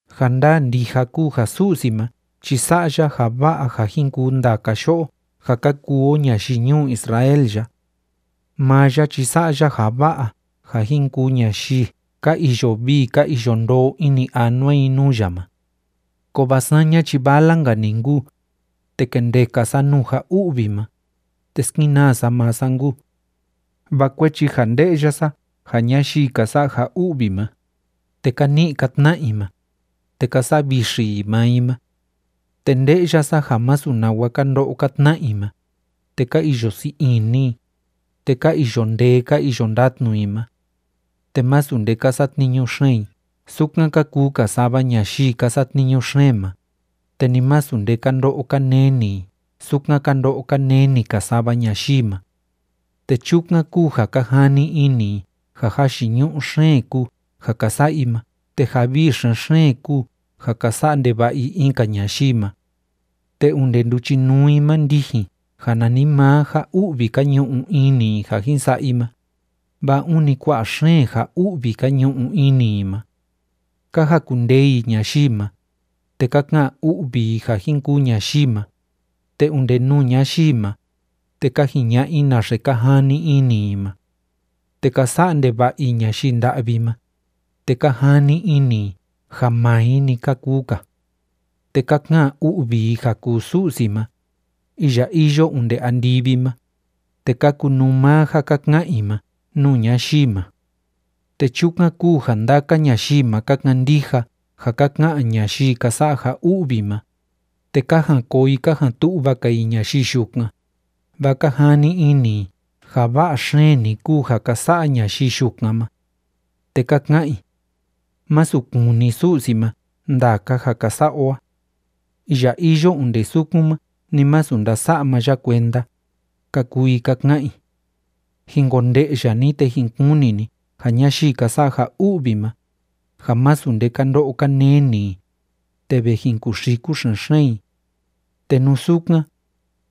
Ja ndaa ndija kúu ja Su'si ma chi sa'a ya ja va'a ja jin kuu ndaka yo'o ja ka kuu o ñayii ñuu Israel ya. Maa ya chi sa'a ya ja va'a ja jin kuu ñayii ka iyo vii ka iyo ndoo ini anua i nuu ya ma. Kovaa saña chi vala‑nka‑ni nkuu, te kendeka sa nuu ja u'vi ma, te skenaa sa maa sa nkuu. Vaa kuechi ja nde'ya sa ja ñayii ka sa'a ja u'vi ma, te ka ni'i ka tna'a i ma, te ka sa'a vixi i maa i ma. Te nde'ya sa ja másu nawa ka ndo'o ka tna'a i ma, te ka iyo sii ini i, te ka iyo ndee ka iyo ndatnu i ma. Te masu nde ka satniñu xeen i sukan ka kuu‑ka sava ñayii ka satniñu xeen ma, te ni masu nde ka ndo'o ka neni i sukan ka ndo'o ka neni‑ka sava ñayii ma. Te chukan kúu ja ka jani ini i ja jayiñu'u xeen kúu ja ka sa'a i ma te ja vii xen‑xeen kúu ja ka sa'a ndeva'a i in‑ka ñayii ma. Te onde nduchinuu i ma ndijin ja nanimaa ja u'vi ka ñu'u ini i ja jin sa'a i ma, vaa ûni kua'a xeen ja u'vi ka ñu'u ini i ma. Ka jakundee i ñayii ma, te ka ka'an u'vi i ja jin kuu ñayii ma, te onde nuu ñayii ma, te ka jiña'a i naxe ka jani ini i ma. Te ka sa'a ndeva'a i ñayii nda'vi ma, te ka jani ini i ja maa i‑ni ka kuu‑ka. Te ka ka'an u'vi i ja kuu Su'si ma, iya iyo onde andivi ma, te ka kunuu maa ja ka ka'an i ma nuu ñayii ma. Te chukan kúu ja ndaka ñayii ma ka kandija ja ka ka'an ñayii ka sa'a ja u'vi ma, te ka jan koo i ka jan tu'va‑ka i ñayii yukan, vaa ka jani ini i ja va'a xeen‑ni kúu ja ka sa'a ñayii yukan ma. Te ka ka'an i: “Másu kuni Su'si ma ndaka ja ka sa'a o a. Iya iyo onde sukan ma ni masu ndasa'a maa ya kuenda”, ka kuu i ka ka'an i. Jin konde'ya ni, te jin kuni ni ja ñayii ka sa'a ja u'vi ma, ja masu nde ka ndo'o ka neni i, te ve jin kuxiku xen‑xeen i. Te nú sukan,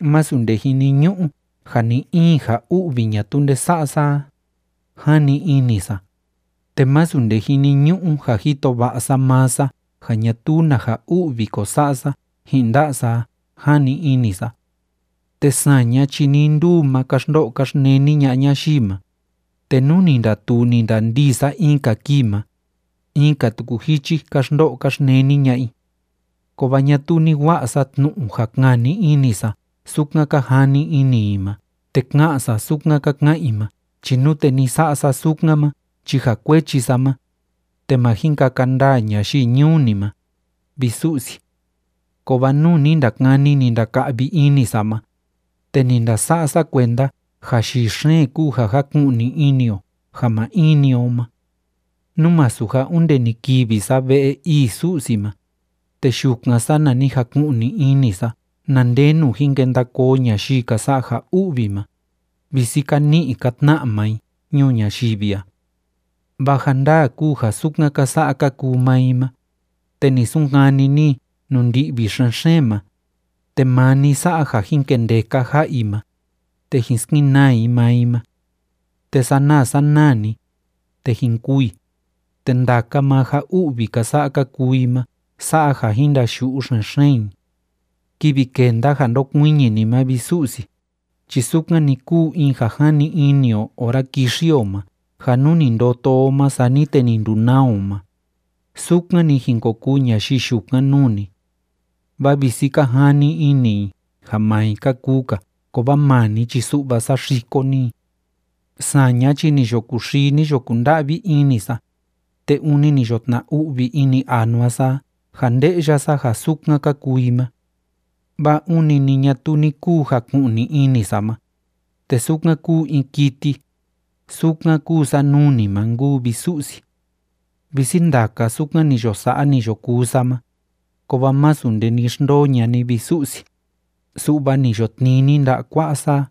masu nde jiniñu'u ja ni‑in ja u'vi ñatuu nde sa'a sa a, jani ini sa, te masu nde jiniñu'u ja jito va'a sa maa sa ja ñatuu na ja u'vi ko sa'a sa ji'in nda'a sa a, jani ini sa. Te saña chi nii nduu ma ka xndo'o ka xneni ña'a ñayii ma, te nú ni ndatuu ni ndandii sa in‑ka kii ma, in‑ka tuku jichi ka xndo'o ka xneni ña'a i. Kovaa ñatuu ni wa'a sa tnu'u ja kani ini sa sukan ka jani ini i ma te ka'an sa sukan ka ka'an i ma chi nute ni sa'a sa sukan ma chi ja kuechi sa ma, te ma jin kaka ndaa ñayii ñuu ni ma, vi Su'si. Kovaa nuu ni ndakani, ni ndaka'vi ini sa ma, te ni ndasa'a sa kuenda ja yii xeen kúu ja jaku'ni ini o ja maa in‑ni o ma. Nú masu ja onde ni kivi sa ve'e ii Su'si ma, te yukan, sana ni jaku'ni ini sa na ndenu jin kenda koo ñayii ka sa'a ja u'vi ma, visi ka ni'i ka tna'a maa i ñuu ñayivi a. Vaa ja ndaa kúu ja sukan ka sa'a ka kuu maa i ma, te ni sunkani ni i nuu ndi'vi xen‑xeen ma, te maa ni sa'a ja jin kendeka ja'a i ma, te jin skenaa i maa i ma. Te sanaa sanaa‑ni, te jin kûu i, te ndaka maa ja u'vi ka sa'a ka kuu i ma sa'a ja jin ndayu'u xen‑xeen i. Kivi kenda ja ndokuiñi ni ma, vi Su'si chi sukan‑ni kúu in ja jani o ora kixi o ma ja nú ni ndoto o ma sani te ni ndunaa o ma, sukan‑ni jin ko kuu ñayii yukan nuu ni. Vaa visi ka jani ini i ja maa i ka kuu‑ka kovaa maa ni chi su'va saxiko ni i. Saña chi ni yo kuxii, ni yo kunda'vi ini sa, te ûni ni yo tna‑u'vi ini anua sa a ja nde'ya sa ja sukan ka kuu i ma. Vaa ûni ni ñatuu ni kuu jaku'ni‑ni ini sa ma, te sukan kúu in kiti, sukan kúu sa nuu ni ma nkuu, vi Su'si. Visi ndaka sukan ni yo sa'a, ni yo kuu sa ma, kovaa masu nde ni xndoo ña'a ni, vi Su'si, su'va ni yo tnii ni nda'a kua'a sa a.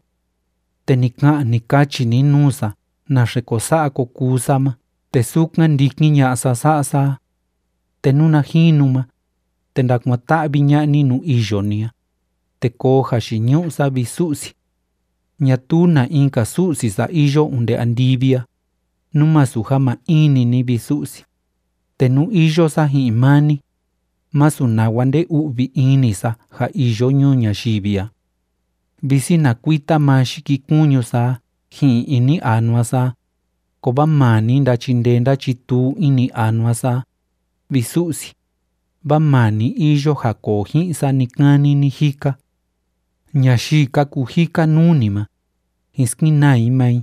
Te ni ka'an, ni kachi ni nuu sa naxe ko sa'a ko kuu sa ma te sukan ndikin ña'a sa sa'a sa a. Te nuna jinu ma, te ndakuan‑ta'vi ña'a ni nuu iyo ni a, te koo jayiñu'u sa, vi Su'si. Ñatuu na in‑ka Su'si sa iyo onde andivi a, nú masu ja maa in‑ni ni, vi Su'si, te nú iyo sa ji'in maa ni, masu nawa nde‑u'vi ini sa ja iyo ñuu ñayivi a. Visi na kuita maa yikikuñu sa a ji'in ini anua sa a, kovaa maa ni ndachindee ndachituu ini anua sa a, vi Su'si, vaa maa ni iyo ja koo ji'in sa ni‑kani ni‑jika. Ñayii ka kujika nuu ni ma, jin skenaa i maa i,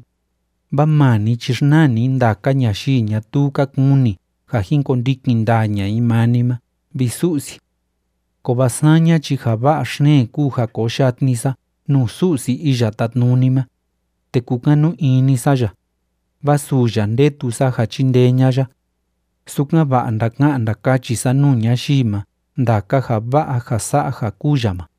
vaa maa ni chi xnaa ni ndaka ñayii ñatuu ka kuni ja jin kondikin ndaa ña'a i maa ni ma, vi Su'si. Kovaa saña chi ja va'a xeen kúu ja koo yatni sa nuu Su'si Iya Tátnuni ma, te kúkanu ini sa ya, vaa suu ya ndetu sa ja chindee ña'a ya, sukan‑va'a ndaka'an ndakachi sa nuu ñayii ma ndaka ja va'a ja sa'a ja kúu ya ma.